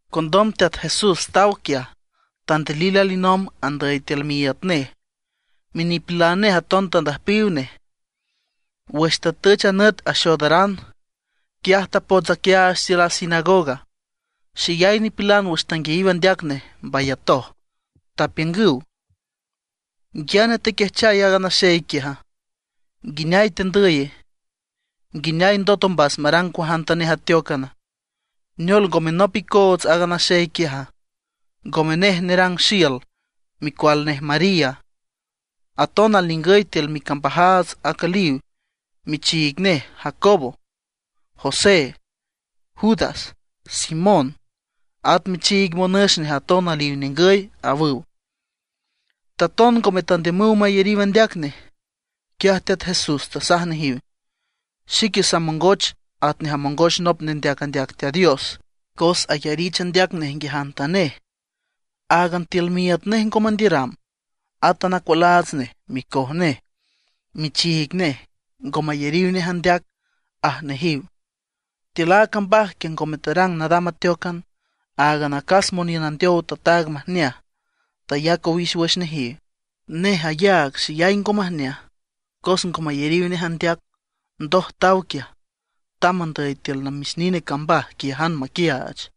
Condom Teat Jesús taw quiaj, tandilil alinomb andüy tiül miíüt nej, minipilan nej aton tandüjpiw nej. Wüx tatüch a nüt axoodaran, quiaj tapots aquiaach tiül a sinagoga. Xeyay nipilan wüx tanguiayiw andeac nej mbayatoj. Tapiüngüw: ―¿Nguiaane tequiajchay aaga naxey quiaja? ¿Nguineay tendüye? ¿Nguineay ndot ombas marang cuajantanej ateócan? ¿Neol ngome nop icoots aaga naxey quiaja? ¿Ngome nej nerang xiül, micual nej María? Aton alningüy tiül micambajaats acüliw michiig nej Jacobo, José, Judas, Simón, at michiig monüx nej aton aliw ningüy ―awüw. Taton ngome tandiümüw mayariw andeac nej. Quiaj Teat Jesús tasaj nejiw: ―Xique samongoch atnej amongoch nop nendeac andeac Teat Dios cos ayarich andeac nej nguiajantanej, áagan tiül miíüt nej ngo mandiüram. Átan acualaats nej, micoj nej, michiig nej, ngo mayariw nej andeac ―aj nejiw. Tiül a cambaj quiaj ngome tarang nadam ateócan. Áagan acas moniün andeow tataag majneaj, tayac owix wüx nejiw. Nej ayaag xeyay ngo majneaj cos ngo mayariw nej andeac. Ndoj taw quiaj, tamb andüy tiül namix nine cambaj quiájan, maquiaach.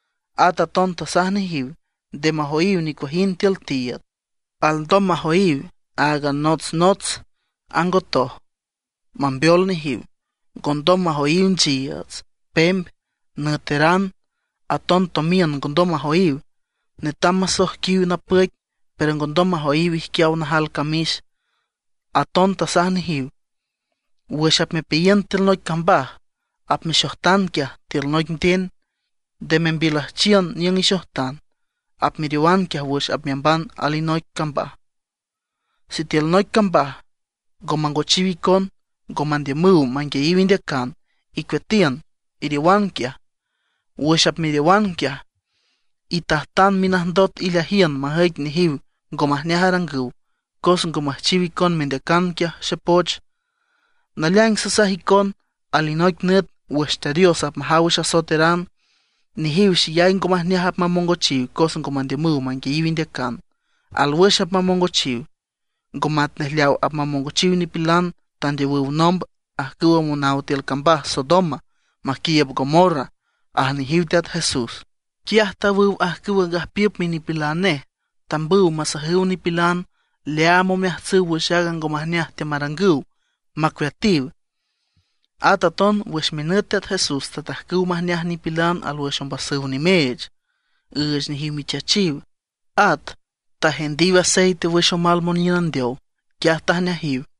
At aton tasaj nejiw nde majoyiw nicuajind tiül tiiüd. Alndom majoyiw áagan notsnots angotoj, mambeol nejiw. Ngondom majoyiw nchiiüts, pemb, nüeteran; aton tomiün ngondom majoyiw. Netam masoijquiw napüic, pero ngondom majoyiw ijquiaw najal camix. Aton tasaj nejiw: ―Wüx apmepeayiün tiül noic cambaj, apmexojtan quiaj tíülan noic nden. Nde membiülüjchiün niüng ixojtan. Apmeriowan quiaj wüx apmeamban tiül alinoic cambaj. Sitiül noic cambaj ngo mangochiw icon, ngo mandiümüw manguiayiw indeacan, icueatiün, iriowan quiaj. Wüx apmeriowan quiaj, itajtan minajndot ileajiün majüic nejiw ngo majneaj arangüw cos ngo müjchiw icon mendeacan quiaj xepoch. Naleaing sasaj icon, alinoic nüt wüx Teat Dios apmajaw wüx asoeteran, nejiw xeyay ngo majneaj apmamongochiw cos ngo mandiümüw manguiayiw indeacan. Alwüx apmamongochiw, ngo matnej leaw apmamongochiw nipilan tandeowüw nomb, ajcüwa monaw tiül cambaj Sodoma maquiiüb Gomorra ―aj nejiw Teat Jesús. Quiaj tawüw ajcüwa gajpiüp minipilan nej, tambüw masajüw nipilan leaam omeajtsüw wüx aaga ngo majneaj teamarangüw, macueatiw. At aton wüx minüt Teat Jesús tatajcüw majneaj nipilan alwüx ombasüw nimeech, üüch nejiw michachiw. At tajendiw aceite wüx omal moniün andeow, quiaj tajneajiw.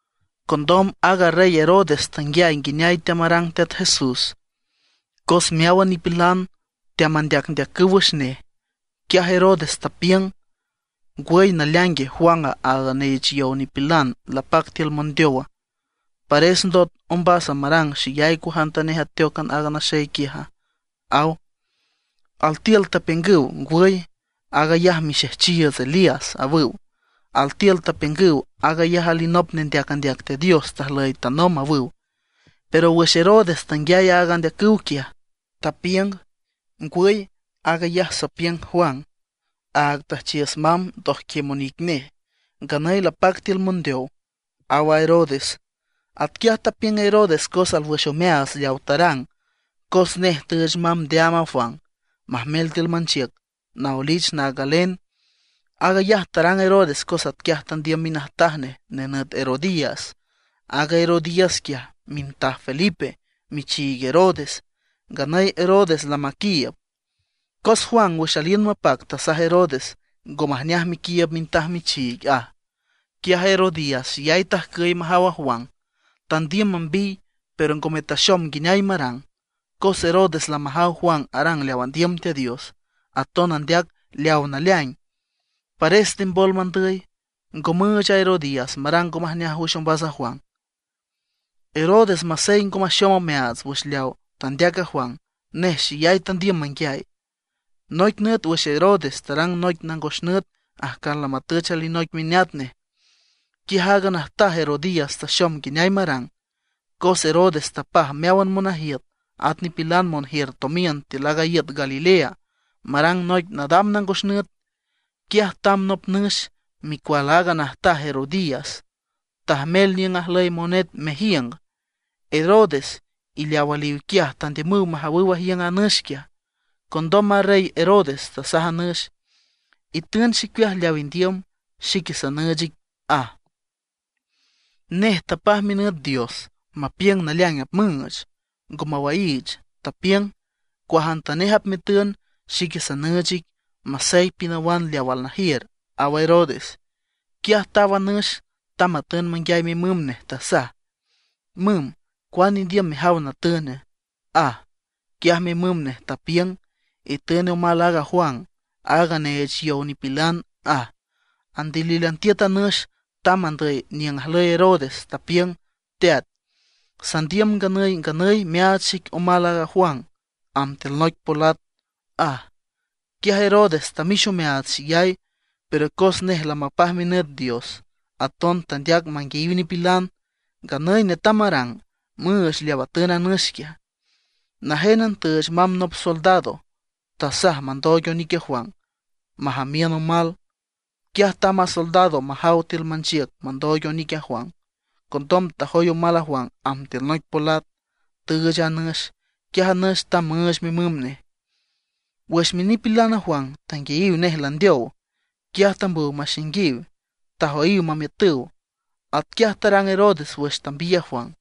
Condom aaga rey Herodes tanguiay nguineay teamarang Teat Jesús, cos meáwan nipilan teamandeacüw wüx nej. Quiaj Herodes tapiüng: ―¿Ngwüy naleaingue, Juan, aaga neech yow nipilan lapac tiül mondeowa? ¿Pares ndot ombas marang xeyay cuajantanej ateócan aaga naxey quiaja? ―aw. Altiül tapiüngüw: ―Ngwüy, aag ayaj mixejchiiüts Elías, awüw. Altiül tapiüngüw: Aag ayaj alinop nendeac andeac Teat Dios tajlüy tanomb ―awüw. Pero wüx Herodes tanguiay aaga andeacüw quiaj, tapiüng: ―Ngwüy, aag ayaj sapiüng Juan, aaga tüjchiüs mamb ndojquiüm onic nej, nganüy lapac tiül mondeow ―aw a Herodes. Atquiaj tapiüng Herodes cos alwüx omeaats leawa tarang, cos nej tüüch mamb ndeaam a Juan, majmel tiül manchiüc, naoelich naag galen. Aag ayaj tarang Herodes cos atquiaj tandiüm minajtaj nej nenüt Herodías. Aaga Herodías quiaj mintaj Felipe, michiig Herodes, nganüy Herodes lamaquiiüb. Cos Juan wüx aliün mapac tasaj Herodes: ―Ngo majneaj mequiiüb mintaj michiig ―aj. Quiaj Herodías xeyay tajcüy majaw a Juan. Tandiüm mambiy; pero ngome taxom nguineay marang. Cos Herodes lamajaw Juan arang leaw andiüm Teat Dios, aton andeac leaw naleaing, pares tembol mandüy, ngo müüch a Herodías marang ngo majneaj wüx ombas a Juan. Herodes masey ngo maxom omeaats wüx leaw tandeac a Juan, nej xeyay tandiüm manguiay. Noic nüt wüx Herodes tarang noic nangos nüt ajcan lamatüch alinoic mineat nej, quiaj aaga najtaj Herodías taxom nguineay marang. Cos Herodes tapaj meáwan monajiüt, at nipilan monjiür tomiün tiül aaga iüt Galilea, marang noic nadam nangos nüt. Quiaj tamb nop nüx, micual aaga najtaj Herodías, tajmel niüng ajlüy monet mejiüng. Herodes y leaw aliw quiaj tandiümüw majawüw ajiüng a nüx quiaj. Condom a rey Herodes tasaj a nüx: ―Itün xicueaj leaw indiüm, xique sanüüch ic ―aj. Nej tapaj minüt dios mapiüng naleaing apmüüch, ngo mawaiich, tapiüng: ―Cuajantanej apmetün, xique sanüüch ic, masey pinawan leaw alnajiür ―aw a Herodes. Quiaj taw a nüx, tamb matün manguiay mimüm nej. Tasaj: ―Müm, ¿cuane indiüm mejaw natüna? ―aj. Quiaj mimüm nej tapiüng: ―Itün omal aaga Juan, áag neech yow nipilan ―aj. Andilílan tiüt a nüx, tamb andüy niüng ajlüy Herodes, tapiüng: ―Teat, sandiüm nganüy nganüy meaach xic omal aaga Juan amb tiül noic polat ―aj. Quiaj Herodes tamix omeaats xeyay; pero cos nej lamapaj minüt dios, aton tandeac manguiayiw nipilan. Nganüy netam marang, müüch leaw atün a nüx quiaj. Najénan tüüch mamb nop soldado, tasaj mandooig onic a Juan majamiün omal. Quiaj tamb a soldado majaw tiül manchiüc mandooig onic a Juan. Condom tajoy omal a Juan amb tiül noic polat, tüüch a nüx. Quiaj a nüx tamb müüch mimüm nej. Wüx minipilan Juan tanguiayiw nej landeow, quiaj tambüw maxainguiw, tajoyiw mamiütüw. Atquiaj tarang Herodes wüx tambiy aaga Juan.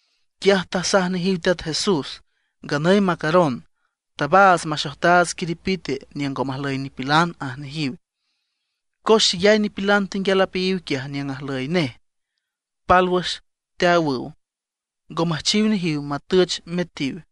Quiaj tasaj nejiw Teat Jesús: ―Nganüy macaron, tabaats maxojtaats quiripite niüng ngo majlüy nipilan ―aj nejiw. Cos xeyay nipilan tenguial apeayiw quiaj niüng ajlüy nej, pálwüx teawüw. Ngo müjchiw nejiw matüch metiw.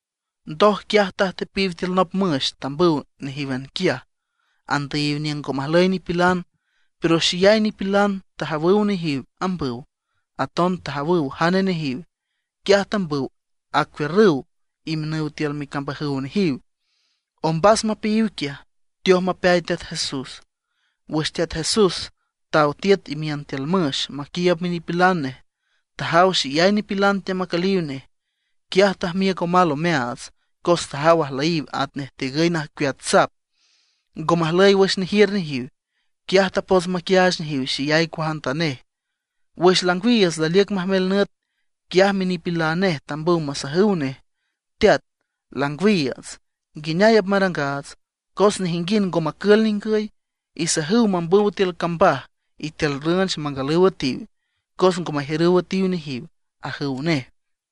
Ndoj quiaj tajtepiw tiül nop müx, tambüw nejíwan quiaj, andüyiw niüng ngo majlüy nipilan. Pero xeyay nipilan tajawüw nejiw ambüw, aton tajawüw jane nejiw; quiaj tambüw acuiürrüw imiünüw tiül micambajüw nejiw. Ombas mapeayiw quiaj, teoj mapeay Teat Jesús. Wüx Teat Jesús taw tiüt imiün tiül müx maquiiüb minipilan nej, tajaw xeyay nipilan teamacüliw nej. Quiaj tajmiüc omal omeaats, cos tajaw ajlüyiw atnej tigüy najcueat sap, ngo majlüy wüx nejiür nejiw. Quiaj tapots maquiaach nejiw xeyay cuajantanej. Wüx langwiiüts laliüc majmel nüt, quiaj minipilan nej tambüw masajüw nej: ―Teat, langwiiüts ¿nguineay apmarangaats? Cos nejinguind ngo macül ningüy. Isajüw mambüw tiül cambaj y tiül rünch mangalüw üetiw, cos ngo majiürüw üetiw nejiw ―ajüw nej.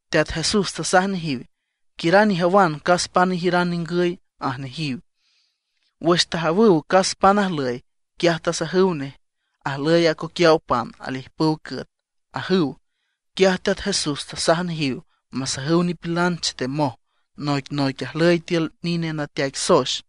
Teat Jesús tasaj nejiw: ―Quiüran ijawan cas pan ijiüran ningüy ―aj nejiw. Wüx tajawüw cas pan ajlüy, quiaj tasajüw nej: ―Ajlüy acoquiaw pan alijpüw cüet ―ajüw. Quiaj Teat Jesús tasaj nejiw masajüw nipilan chetemoj noicnoic ajlüy tiül nine nateaic soex.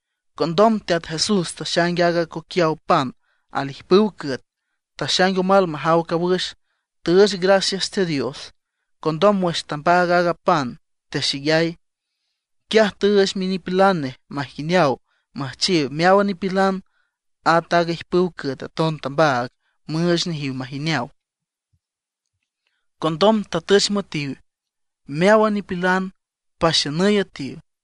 Condom Teat Jesús taxaing aaga acoquiaw pan al ijpüw cüet. Taxaing omal majaw cawüx, tüüch gracias Teat Dios. Condom wüx tambaag aaga pan texeyay. Quiaj tüüch minipilan nej majineaw müjchiw meáwan nipilan. At aaga ijpüw cüet aton tambaag müüch nejiw majineaw. Condom tatüch müetiw meáwan nipilan paxiünüy üetiw.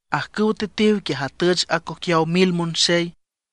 Ajcüwa tetiw quiaj atüch acoquiaw mil monxey.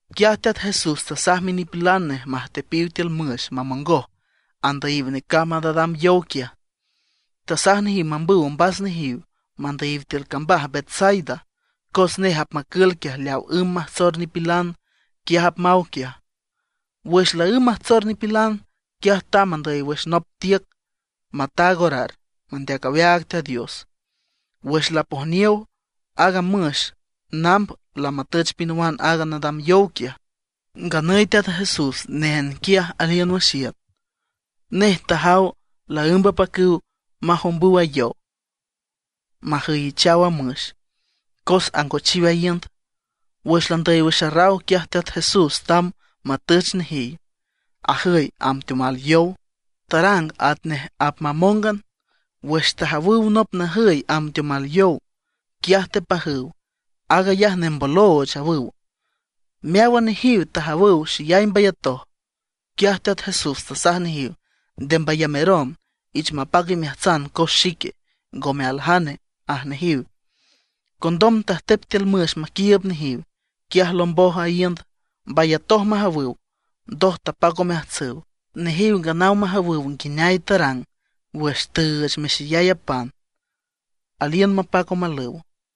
Quiaj Teat Jesús tasaj minipilan nej majtepiw tiül müx mamongoj andüyiw necamb a nadam yow quiaj. Tasaj nejiw mambüw ombas nejiw mandüyiw tiül cambaj Betsaida. Cos nej apmacül quiaj leawa ümb majtsor nipilan, quiaj apmaw quiaj. Wüx laǘmb majtsor nipilan, quiaj tamb andüy wüx nop tiüc mataag orar, mandeac aweaag Teat Dios. Wüx lapojniow, aaga müx namb lamatüch pinawan aaga nadam yow quiaj, nganüy Teat Jesús néjan quiaj aliün wüx iüt. Nej tajaw laǘmb apacüw majombüw a yow majüyichaw a müx, cos angochiw a iünd. Wüx landüy wüx arraw, quiaj Teat Jesús tamb matüch nejiw, ajüy amb teomal yow. Tarang atnej apmamóngan. Wüx tajawüw nop najüy amb teomal yow, quiaj tepajüw: ―¡Aag ayaj nembolooch! ―awüw. Meáwan nejiw tajawüw, xeyay mbayatoj. Quiaj Teat Jesús tasaj nejiw: ―Nde mbayameron, ich mapac imeajtsan cos xique, ngome aljane ―aj nejiw. Condom tajtep tiül müx maquiiüb nejiw; quiaj lomboj a iünd. Mbayatoj majawüw, ndoj tapac omeajtsüw Nejiw nganaw majawüw nguineay tarang wüx tüüch mexeyay a pan, aliün mapac omalüw.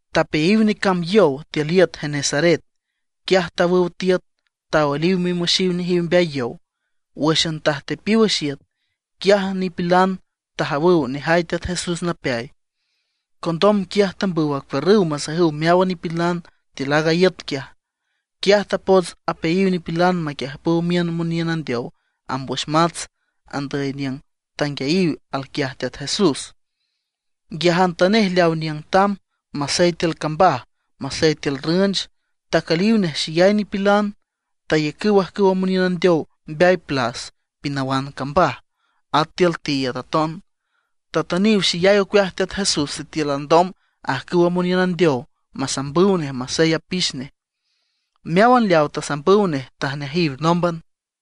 Tapeayiw necamb a yow tiül iüt Genesaret. Quiaj tawüw tiüt, taoeliw mimüxiw nejiw mbeay yow. Wǘxan tajtepiw wüx iüt, quiaj nipilan tajawüw nejay Teat Jesús napeay. Condom quiaj tambüw acuiürrüw masajüw meáwan nipilan tiül aaga iüt quiaj. Quiaj tapots apeayiw nipilan maquiüjpüw miün moniün andeow amb wüx mats, andüy niüng tanguiayiw alquiaj Teat Jesús. Nguiajantanej leaw niüng tamb, masey tiül cambaj, masey tiül rünch, tacüliw nej xeyay nipilan. Tayacüw ajcüwa moniün andeow mbeay plas pinawan cambaj, at tiül tiiüd aton. Tatüniw xeyay ocueaj Teat Jesús sitiül alndom ajcüwa moniün andeow masambüw nej masey apix nej. Meáwan leaw tasambüw nej tajneajiw nómban.